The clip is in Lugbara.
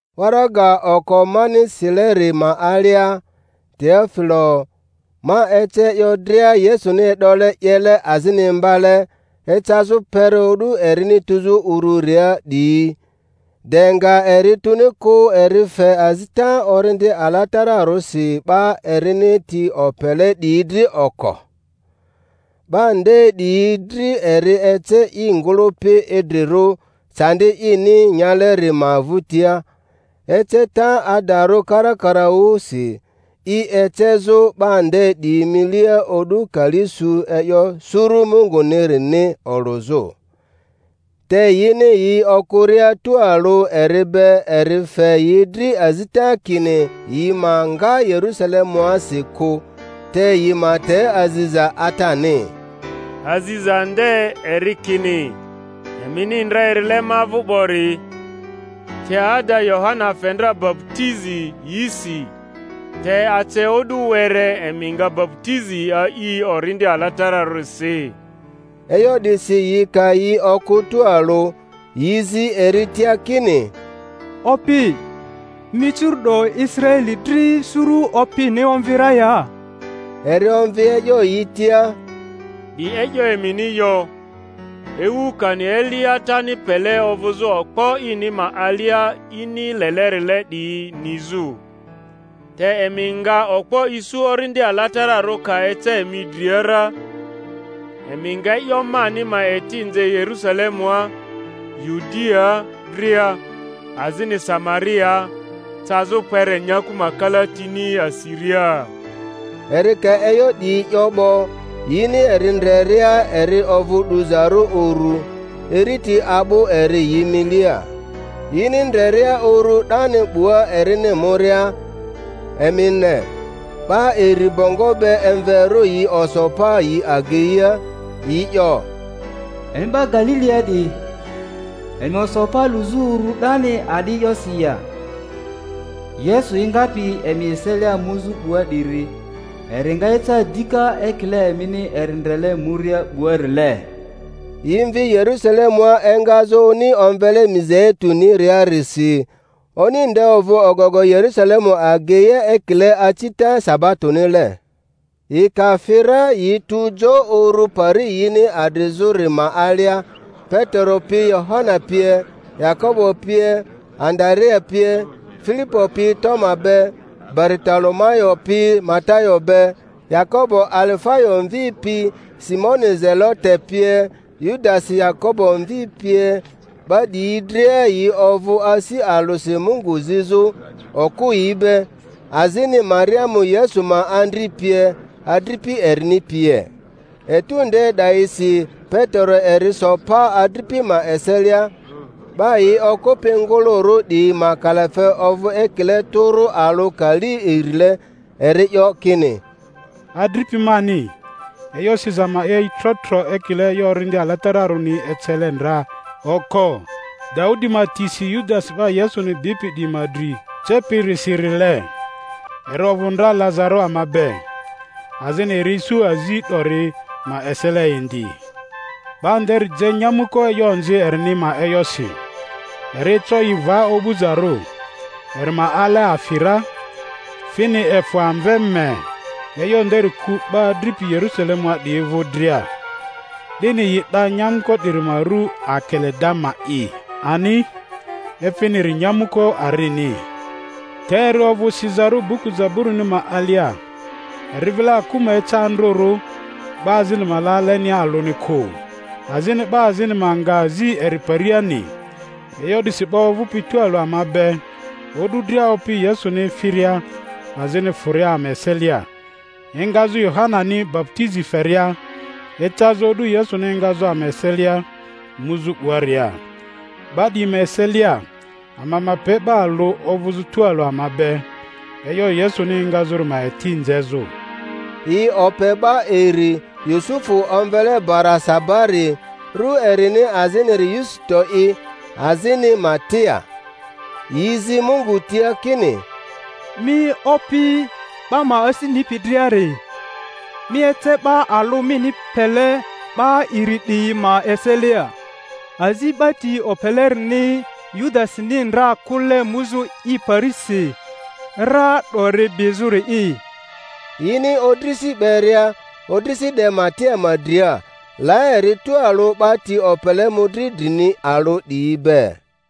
Waraga oko mani sileri ma alia, Teofilo, ma ece e'yo dria Yesuni e'dole 'yele azini imbale ecazᴜ kpere o'du erini tuzᴜ ururia 'diyi; de nga eri tuni kᴜ eri fe azita Orindi Alatararᴜsi 'ba erini ti opele 'diyi dri oko. 'Ba nde 'diyi dri eri ece i ngᴜlᴜpi idrirᴜ candi ini nyaleri ma vᴜtia, eceta adarᴜ karakaraᴜsi, i ecezᴜ 'ba nde 'diyi milia o'du kali su e'yo suru Mungunirini olᴜzᴜ. Te yini yi okᴜria tualᴜ eri be eri fe yi dri azita kini yi ma nga Yerusalemuasi kᴜ, te yi ma te aziza Atani; Aziza nde, eri kini, emini ndra erile ma vᴜ 'bori; te ada Yohana fe ndra baputizi yisi, te ace o'du were emi nga baputizi a'i Orindi Alatararᴜsi. E'yo 'disi yi ka yi okᴜ tualᴜ, yi zi eri tia kini, Opi, mi curu'do Israeli dri suru opini omvi ra ya? Eri omvi e'yo yi tia, Di e'yo emini yo, ewu kani eli Atani pele ovᴜzᴜ okpo ini ma alia ini lelerile 'diyi nizᴜ. Te emi nga okpo isu Orindi Alatararᴜ ka eca emi dria ra, emi nga e'yo mani ma eti nze Yerusalemua, Yudiaa dria, azini Samariaa, cazᴜ kpere nyaku ma kalatini asiria. Eri ka e'yo 'diyi 'yo 'bo, yini eri ndreria eri ovᴜ 'duzarᴜ uru, iriti a'bᴜ eri yi milia. Yini ndreria uru 'dani 'bua erini muria, emi ne, 'ba iri bongo be emverᴜ yi oso pa yi ageia, yi 'yo, Emi 'ba Galilia 'diyi, emi oso pa luzᴜ uru 'dani a'di e'yosi ya? Yesu engapi emi eselia muzᴜ 'bua 'diri, eri nga eca dika ekile emini eri ndrele muria 'buarile. Yi mvi Yerusalemua engazᴜ oni omvele Mizeituniriarisi; oni nde ovᴜ ogogo Yerusalemu ageia ekile acita sabatonile. Yi ka fi ra yi tu jo uru pari yini adrizᴜri ma alia; Petero pi Yohana pie, Yakobo pie, Andarea pie, Filipo pi Toma be, Baritolomayo pi Matayo be, Yakobo Alifayo mvi pi Simoni Zelote pie, Yudasi Yakobo mvi pie. 'Ba 'diyi dria yi ovᴜ asi alᴜsi Mungu zizᴜ, okᴜyi be, azini Mariamu Yesu ma andri pie, adripi erini pie. Etu nde 'dayisi Petero eri so pa adripi ma eselia ('ba yi okᴜpi ngᴜlᴜrᴜ 'diyi ma kalafe ovᴜ ekile tᴜrᴜ alᴜ kali irile), eri 'yo kini, Adripi mani, e'yo siza ma 'ye i tro-tro ekile e'yo Orindi Alatararᴜni ecele ndra oko Daudi ma tisi Yudasi 'ba Yesuni bipi 'diyi ma dri cepirisirile. Eri ovᴜ ndra lazarᴜ ama be, azini eri isu azi 'dori ma esele indi. ('Ba nderi je nyamᴜko e'yo onzi erini ma oyasi; eri eco i va o'buzarᴜ, eri ma ale afi ra, fini efᴜ amve mee. E'yo nderi ku 'ba adripi Yerusalemua 'diyi vᴜ dria, 'dini yi 'da nyamᴜko 'diri ma ru Akeledama'i ani, efiniri Nyamᴜko Arini.) Te eri ovᴜ sizarᴜ buku Zaburini ma alia, Eri vile aku ma eca andrᴜrᴜ, 'ba azini ma la alenia alᴜni kᴜ; azini 'Ba azini ma nga azi eri pariani. E'yo 'disi 'ba ovᴜpi tualᴜ ama be o'du dria Opi Yesuni efiria azini fᴜria ama eselia, engazᴜ Yohanani baputizi feria ecazᴜ o'du Yesuni engazᴜ ama eselia muzᴜ 'buaria—'ba 'diyi ma eselia ama ma pe 'ba alᴜ ovᴜzᴜ tualᴜ ama be e'yo Yesuni engazᴜri ma eti nzezᴜ. Yi ope 'ba iri, Yusufu omvele Barasabari, ru erini aziniri Yusito'i, azini Matia. Yi zi Mungu tia kini, Mi Opi 'ba ma asi nipi driari, mi ece 'ba alᴜ mini pele 'ba iri 'diyi ma eselia azi 'ba ti opelerini Yudasini ndra kᴜle muzᴜ i parisi ra 'dori bizᴜri'i. Yini odrisi 'beria, odrisi 'de Matia ma dria; la eri tualᴜ 'ba ti opele mᴜdri drini alᴜ 'diyi be.